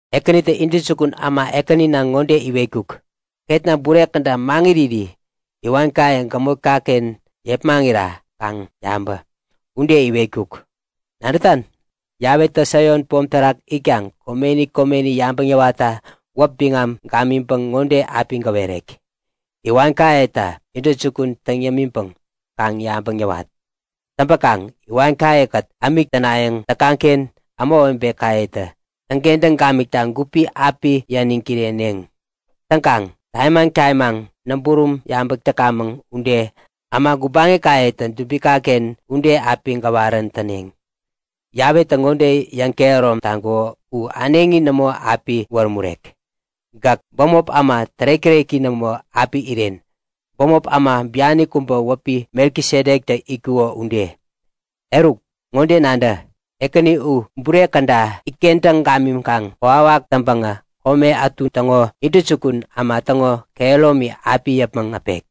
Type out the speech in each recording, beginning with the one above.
Ekänitä intäjukun äma ekänina ŋode iwetkuk; Ketna bure käda maŋiriri iwankaye gämotkaken yepmaŋira kaŋ yabä! Ude iwetkuk. Nadätan? Yawetä Saion pom terak itkaŋ komeni komeni yabäŋ yäwatta wäp biŋam gamiŋpäŋ ŋode api gäwerek; Iwankayeta intäjukun täŋ yämiŋpäŋ kaŋ yabäŋ yäwat. Täŋpäkaŋ iwankayekät ämik tänayäŋ täkaŋken ämawebekayetä täŋkentäŋ gamikta gupi api yäniŋ kireneŋ. Täŋkaŋ tamimaŋ tamimaŋ näburum yabäk täkamäŋ ude äma gubaŋikayetä dubikaken ude api gäwarän täneŋ. Yawetä ŋode yäŋkehärom taŋkuko u äneŋi nämo api wärämurek; Gäk bämop äma tärek-täreki nämo api iren, bämop äma biani kubä wäpi Melkisedektä itkuko ude. Eruk, ŋode nadä; Ekäni u bure käda itkentäŋ gamiŋkaŋ kokwawak täŋpäŋä kome ätu täŋo intäjukun äma täŋo kehäromi api yäpmäŋ äpek.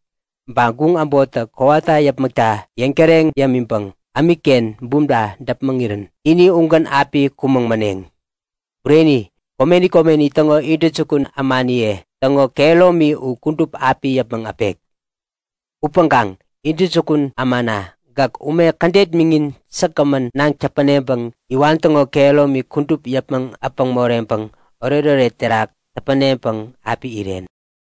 Ba guŋ äbottä kowata yäpmäkta yäŋtäreŋ yämiŋpäŋ ämikken bumta däpmäŋirän ini ugän api kumäŋ maneŋ. Bureni, komeni komeni täŋo intäjukun ämaniye täŋo kehäromi u kudup api yäpmäŋ äpek. Upäŋkaŋ intäjukun ämana gäk, ume kädet miŋin säkgämän naŋ täpäneŋpäŋ iwan täŋo kehäromi kudup yäpmäŋ äpäŋ moreŋpäŋ oretoret terak täpäneŋpäŋ api iren.